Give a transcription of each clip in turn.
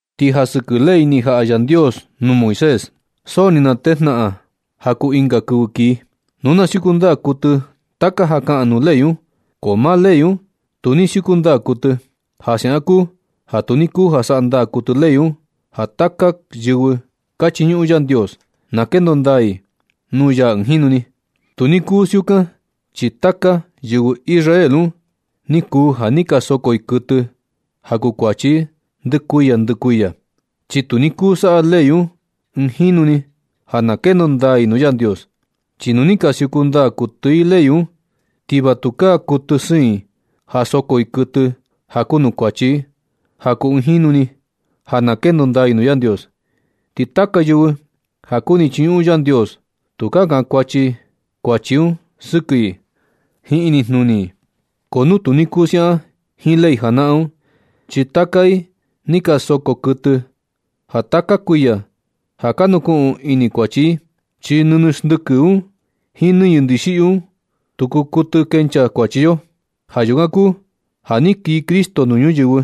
Ti ja sɨkɨ ley ni jaꞌa Yandios nuu Moisés, so ni natejnaꞌan ja kuu ɨnga kɨvɨ kii, nu na siuku ndaa kuɨtɨ taka ja kaꞌan nuu ley un, ko maa ley un tu ni siuku ndaa kuɨtɨ. Ja siaꞌan kuu ja tu ni kuu ja saꞌa ndaa kuɨtɨ ley un ja taka yɨvɨ ka chiñuꞌun Yandios, na kendo ndaa i nuu ya ɨɨn jinu ni. Tu ni kuu siukan, chi taka yɨvɨ Israel un ni kuu ja ni ka soko i kuɨtɨ ja kuu kuachi i ndɨ kuiya ndɨ kuiya. Chi tu ni kuu saꞌa ley un ɨɨn jinu ni ja na kendo ndaa i nuu Yandios. Chi nu ni ka siuku ndaa kuɨtɨ i ley un, ti va tukaa kuɨtɨ siin i ja soko i kuɨtɨ ja kuu nuu kuachi i ja kuu ɨɨn jinu ni ja na kendo ndaa i nuu Yandios, ti taka yɨvɨ ja kuni chiñuꞌun Yandios tukaa kankuachi kuachi un sɨkɨ i jiin inijnuni i. Ko nu tu ni kuu siaꞌan jiin ley janaꞌan un, chi taka i ni ka soko kuɨtɨ ja taka kuiya, ja ka nukuꞌun ini kuachi i. Chi nɨñɨ xndɨkɨ un jiin nɨñɨ ndixiꞌyu un, tu kuu kuɨtɨ kenchaa kuachi yo. Ja yukan kuu ja na ni kii Cristo nuu ñuyɨvɨ,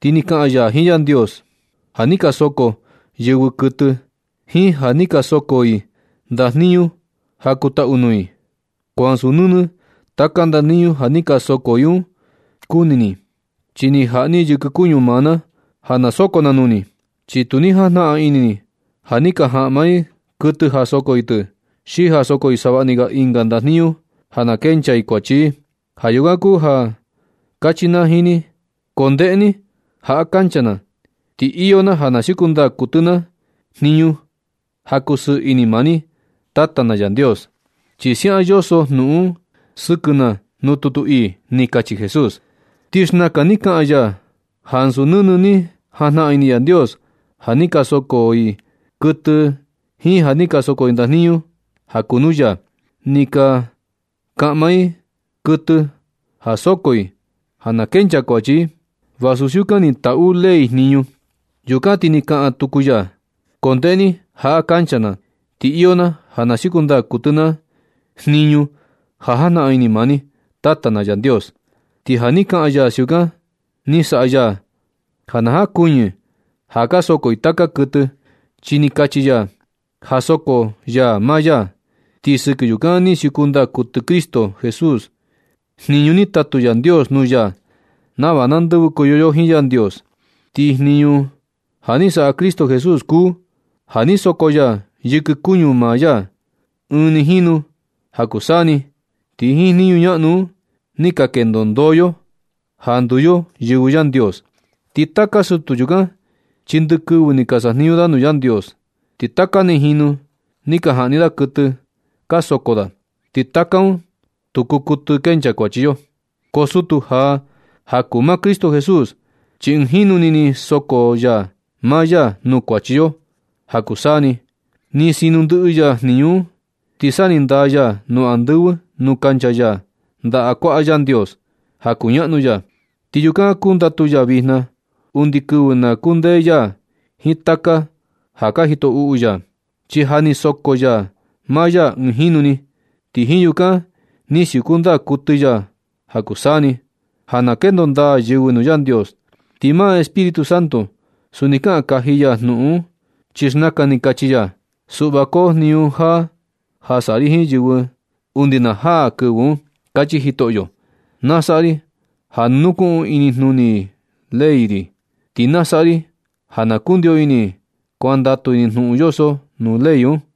ti ni kaꞌan ya jiin Yandios: Ja ni ka soko yɨvɨ kuɨtɨ, jiin ja ni ka soko i ndajniñu ja kuu taꞌu nuu ni. Ko ansu nɨnɨ taka ndajniñu ja ni ka soko i un kuni ni. Chi ni jaꞌa ni yɨkɨ kuñu maa na ja na soko na nuu ni. Chi tu ni jajnaꞌan ini ni ja ni ka jaꞌma i kuɨtɨ ja soko i tɨ, xi ja soko i savaꞌni ga ɨnga ndajniñu ja na kenchaa i kuachi i. Ja yukan kuu ja ni kachi na jiin ni: “Ko ndeꞌe ni, jaꞌa kancha na, ti iyo na ja na siuku ndaa kuɨtɨ na jniñu ja kusɨɨ ini maa ni, Tata na Yandios. Chi siaꞌan ja yoso jnuꞌun un sɨkɨ na nuu tutu ii.” Ni kachi Jesús. Ti xnakan ni kaꞌan ya ja ansu nɨnɨ ni jajnaꞌan ini Yandios ja ni ka soko i kuɨtɨ, jiin na ni ka soko i ndajniñu ja kuu nuu ya, ni ja kaꞌma i kuɨtɨ ja soko i ja na kenchaa kuachi i, vasu siukan ni taꞌu ley jniñu. Yukan ti ni kaꞌan tuku ya: “Ko ndeꞌe ni, jaꞌa kancha na, ti iyo na ja na siuku ndaa kuɨtɨ na jniñu ja jajnaꞌan ini maa ni, Tata na Yandios.” Ti ja ni kaꞌan ya siukan ni saꞌa ya ja na jankuɨñɨ ja ka soko i taka kuɨtɨ, chi ni kachi ya ja soko ya maa ya. Ti sɨkɨ yukan ni siuku ndaa kuɨtɨ Cristo Jesús jniñu ni tatu Yandios nuu ya nava na ndɨvɨkoyo yo jiin Yandios. Ti jniñu ja ni saꞌa Cristo Jesús kuu ja ni soko ya yɨkɨ kuñu maa ya ɨɨn ni jinu ja kuu saa ni. Ti jiin jniñu ñaꞌnu un ni ka kendo ndoo yo ja nduu yo yɨvɨ Yandios. Ti taka sutu yukan, chi ndɨ kɨvɨ ni ka sajniñu da nuu Yandios, ti taka ni jinu ni ka jaꞌni da kuɨtɨ ka soko da. Ti taka un tu kuu kuɨtɨ kenchaa kuachi yo. Ko sutu jaa ja kuu maa Cristo Jesús, chi ɨɨn jinu ni ni soko ya maa ya nuu kuachi yo ja kuu saa ni. Ni sino ndɨꞌɨ ya jniñu un, ti sa ni ndaa ya nu andɨvɨ nuu kancha ya ndaꞌa kuaꞌa Yandios ja kuñaꞌnu ya. Ti yukan kundatu ya vijna, undi kɨvɨ na kundee ya jiin taka ja ka jito uꞌu ya. Chi ja ni soko ya maa ya ɨɨn jinu ni, ti jiin yukan ni siuku ndaa kuɨtɨ ya ja kuu saa ni ja na kendo ndaa yɨvɨ nuu Yandios. Ti maa Espíritu Santo, suni ni kaꞌan kaji ya jnuꞌun un, chi xnakan ni kachi ya: Suꞌva koo jniñu jaa ja saꞌa ri jiin yɨvɨ undi na jaa kɨvɨ un, kachi Jitoꞌo. Na saꞌa ri ja na nukuꞌun inijnuni i ley ri. Ti na saꞌa ri ja na kundio ini i kuandatu i nuu jnuꞌun yoso nuu ley ri.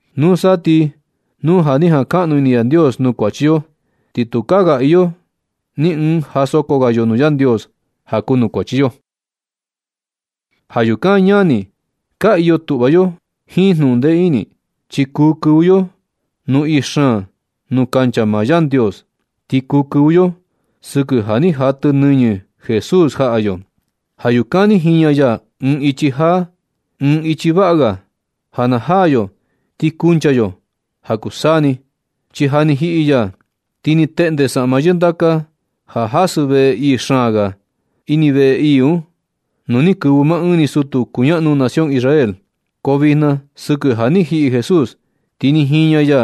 Nusa ti nu ja ni jankaꞌnu ini Yandios nuu kuachi yo, ti tukaa ga iyo ni ɨɨn ja soko ga yo nuu Yandios ja kuu nuu kuachi yo. Ja yukan ñani, ka iyo tuꞌva yo jiin jnuꞌun ndee ini, chi kuu kɨvɨ yo nuu ii xaan nuu kancha maa Yandios. Ti kuu kɨvɨ yo sɨkɨ ja ni jatɨ nɨñɨ Jesús jaꞌa yo. Ja yukan ni jiña ya ɨɨn ichi jaa, ɨɨn ichi vaꞌa ga ja na jaa yo ti kuncha yo ja kuu saa ni, chi na ni jiꞌi ya ti ni teꞌnde saꞌma yɨndaka ja jasɨ veꞌe ii xaan ga ini veꞌe ii un, nuu ni kɨvɨ maa ɨɨn ni sutu kuñaꞌnu nación Israel. Ko vijna sɨkɨ ja ni jiꞌi Jesús, ti ni jiña ya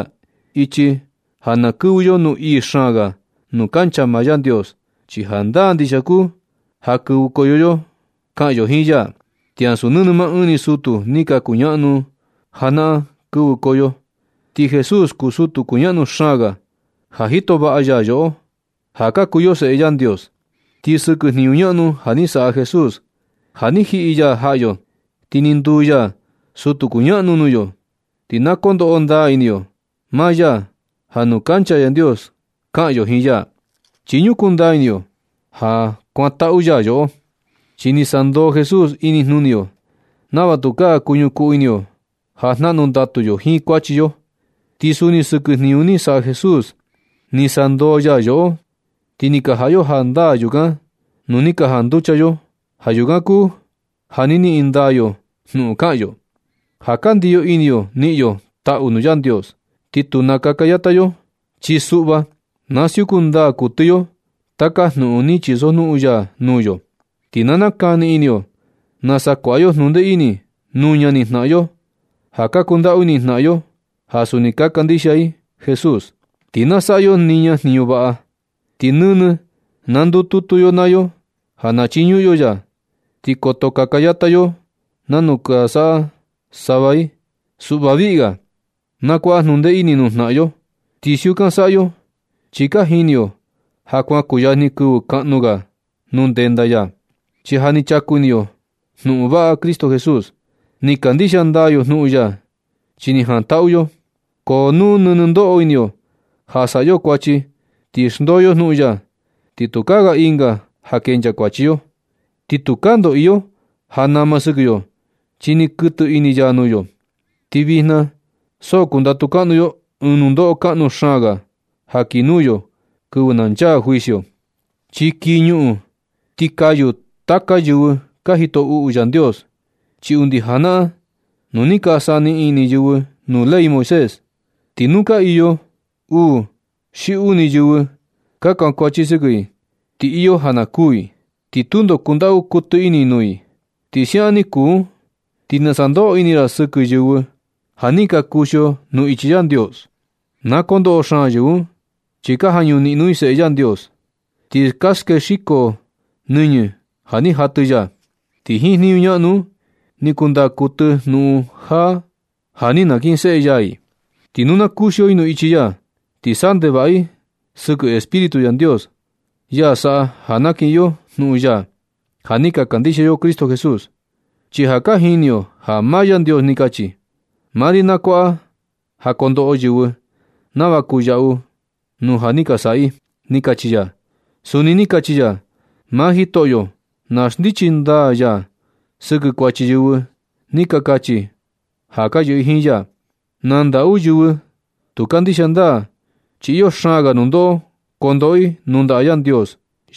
ichi ja na kɨvɨ yo nuu ii xaan ga nuu kancha maa Yandios. Chi jandaa ndixia kuu ja kɨvɨkoyo yo kaꞌan yo jiin ya, ti ansu nɨnɨ maa ɨɨn ni sutu ni ka kuñaꞌnu najanaꞌan kɨvɨkoyo. Ti Jesús kuu sutu kuñaꞌnu xaan ga ja jito vaꞌa ya yoꞌo, ja ka kuu yo seꞌe Yandios. Ti sɨkɨ jniñu ñaꞌnu ja ni saꞌa Jesús ja ni jiꞌi ya jaꞌa yo, ti ni nduu ya sutu kuñaꞌnu nuu yo, ti na ko ndoꞌo ndaa ini yo maa ya ja nuu kancha Yandios kaꞌan yo jiin ya, chi ñukuu ndaa ini yo ja kuantaꞌu ya yoꞌo. Chi ni sandoo Jesús inijnuni yo nava tukaa kuñukuu ini yo ja jnaꞌnu ndatu yo jiin kuachi yo. Ti suni sɨkɨ jniñu ni saꞌa Jesús ni sandoo ya yoꞌo, ti ni ka jaꞌa yo jandaa yukan nu ni ka janducha yo. Ja yukan kuu ja na niꞌin ndaa yo jnuꞌun kaꞌan yo, ja ka ndiyo ini yo niꞌin yo taꞌu nuu Yandios. Ti tu nakaka yata yo, chi suꞌva na siuku ndaa kuɨtɨ yo taka jnuꞌun ni chisojnuꞌun ya nuu yo. Ti na nakani ini yo nasa kuaꞌa yo jnundee ini nuu ñani jnaꞌan yo ja ka kundaꞌu ini jnaꞌan yo, ja suni kandixia i Jesús, ti na saꞌa yo niña jniñu vaꞌa. Ti nɨnɨ na ndututu yo naa yo ja na chiñuꞌun yo ya, ti koto kaka yata yo nanu ka saꞌa sava i. Suꞌva viꞌi ga na kuaꞌa jnundee ini nuu jnaꞌan yo, ti siukan saꞌa yo, chi ja ka jini yo ja kuan kuyajni kɨvɨ kaꞌnu ga nuu ndenda ya. Chi ja ni chaku ini yo jnuꞌun vaꞌa Cristo Jesús. Ni kandixia ndaa yo jnuꞌun ya chi ni jantaꞌu yo, ko nu nɨnɨ ndoꞌo ini yo ja saꞌa yo kuachi ti xndoo yo jnuꞌun ya, ti tukaa ga ɨnga iyo ja kenchaa kuachi yo. Ti tukaa ndo iyo ja nama sɨkɨ yo chi ni kuɨtɨ ini ya nuu yo, ti vijna so kundatu kaꞌnu yo ɨɨn nundoꞌo kaꞌnu xaan ga ja kii nuu yo kɨvɨ na chaa juicio, chi kii ñuꞌun ti kayu taka yɨvɨ ka jito uꞌu Yandios. Chi undi janaꞌan nu ni ka saniꞌin ini yɨvɨ nuu ley Moisés, ti nu ka iyo uu xi uni yɨvɨ ka kankuachi sɨkɨ i, ti iyo ja na kuu i, ti tundo kundaꞌu kuɨtɨ ini nuu i. Nu siaꞌan ni kuu un, ti ¿nasa ndoꞌo ini ra sɨkɨ yɨvɨ ja ni ka kuxio nuu ichi Yandios? Na kondoꞌo xaan yɨvɨ un, chi ka jañu niꞌno i Seꞌe Yandios, ti ka skexiko i nɨñɨ ya ja ni jatɨ ya, ti jiin jniñu ñaꞌnu un ni kundaa kuɨtɨ jnuꞌun jaa un ja ni nakinseꞌe ya i. Ti nu na kuxio i nuu ichi ya, ti saꞌa ndevaꞌa i sɨkɨ Espíritu Yandios, ya saꞌa ja ka niꞌin yo jnuꞌun ya ja ni ka kandixia yo Cristo Jesús. Chi ja ka jini yo ja maa Yandios ni kachi: “Maa ri na kuaꞌa ja kondoꞌo yɨvɨ nava kuu yaꞌu nu ja ni saꞌa i”, ni kachi ya. Suni ni kachi ya: “Maa Jitoꞌo na xndichi ndaa ya sɨkɨ kuachi yɨvɨ ni ka kachi ja ka yɨꞌɨ i jiin ya.” Na ndaꞌu yɨvɨ tu kandixia ndaa, chi iyo xaan ga nundoꞌo kondoꞌo i nuu ndaꞌa Yandios,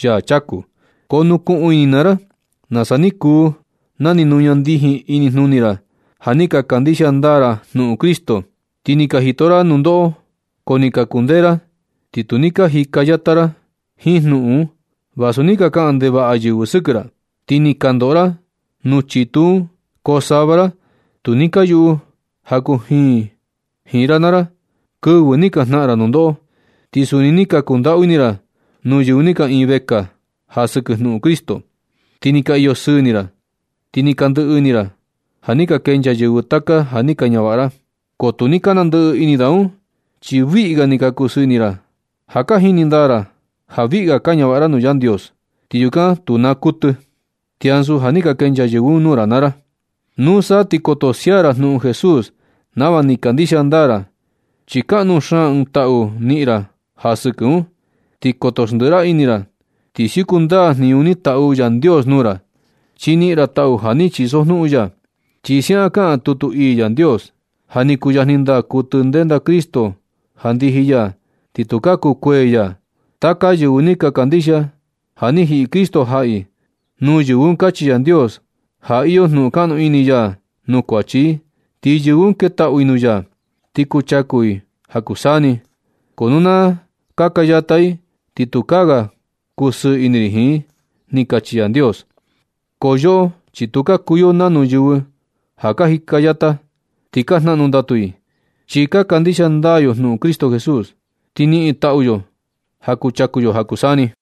yaa chaku. Ko nukuꞌun ini naa ra nasa ni kuu na ni nuña ndijin inijnuni ra ja ni ka kandixia ndaa ra jnuꞌun Cristo, ti ni ka jito ra nundoꞌo, ko ni ka kundee ra ti tu ni ka jika yata ra jiin jnuꞌun un. Vasu ni ka kaꞌan ndevaꞌa yɨvɨ sɨkɨ ra ti ni ka ndoꞌo ra nuu chitu un jiin, ko sava ra tu ni ka yuꞌu ja kujiin jiin ra naa ra kɨvɨ ni ka jnaꞌan ra nundoꞌo. Ti suni ni ka kundaꞌu ini ra nuu yɨvɨ ni ka iin vekaa ja sɨkɨ jnuꞌun Cristo. Ti ni ka iyo sɨɨ ini ra, tu ni ka ndɨꞌɨ ini ra ja ni ka kenchaa yɨvɨ taka ja ni ka ñavaꞌa ra. Ko tu ni ka nandɨꞌɨ ini da un chi viꞌi ga ni ka kusɨɨ ini ra ja ka jini ndaa ra ja viꞌi ga ka ñavaꞌa ra nuu Yandios, ti yukan tu naa kuɨtɨ, ti ansu ja ni ka kenchaa yɨvɨ un nuu ra naa ra. Nusa ti koto sia ra jnuꞌun Jesús nava ni kandixia ndaa ra, chi kaꞌnu xaan ɨɨn taꞌu niꞌin ra ja sɨkɨ un. Ti koto xndiꞌi ra ini ra, ti siuku ndaa jniñu ni taꞌu Yandios nuu ra, chi niꞌin ra taꞌu ja ni chisojnuꞌun ya. Chi siaꞌan kaꞌan tutu ii Yandios: Ja ni kuyajni ndaa kuɨtɨ ndenda Cristo ja ndiji ya, ti tukaa kukuee ya. Taka yɨvɨ ni ka kandixia ja ni jiꞌi Cristo jaꞌa i, nuu yɨvɨ un kachi Yandios ja iyo jnuꞌun kaꞌnu ini ya nuu kuachi i. Ti yɨvɨ un ketaꞌu i nuu ya, ti kuchaku i ja kuu saa ni. Ko nu na kaka yata i, ti tukaa ga kusɨɨ ini ri jiin i. Ni kachi Yandios. Ko yoꞌo chi tu ka kuu yo nanu yɨvɨ ja ka jika yata, ti ka jnaꞌnu ndatu i. Chi ka kandixia ndaa yo jnuꞌun Cristo Jesús, ti niꞌin taꞌu yo ja kuchaku ja kuu saa ni.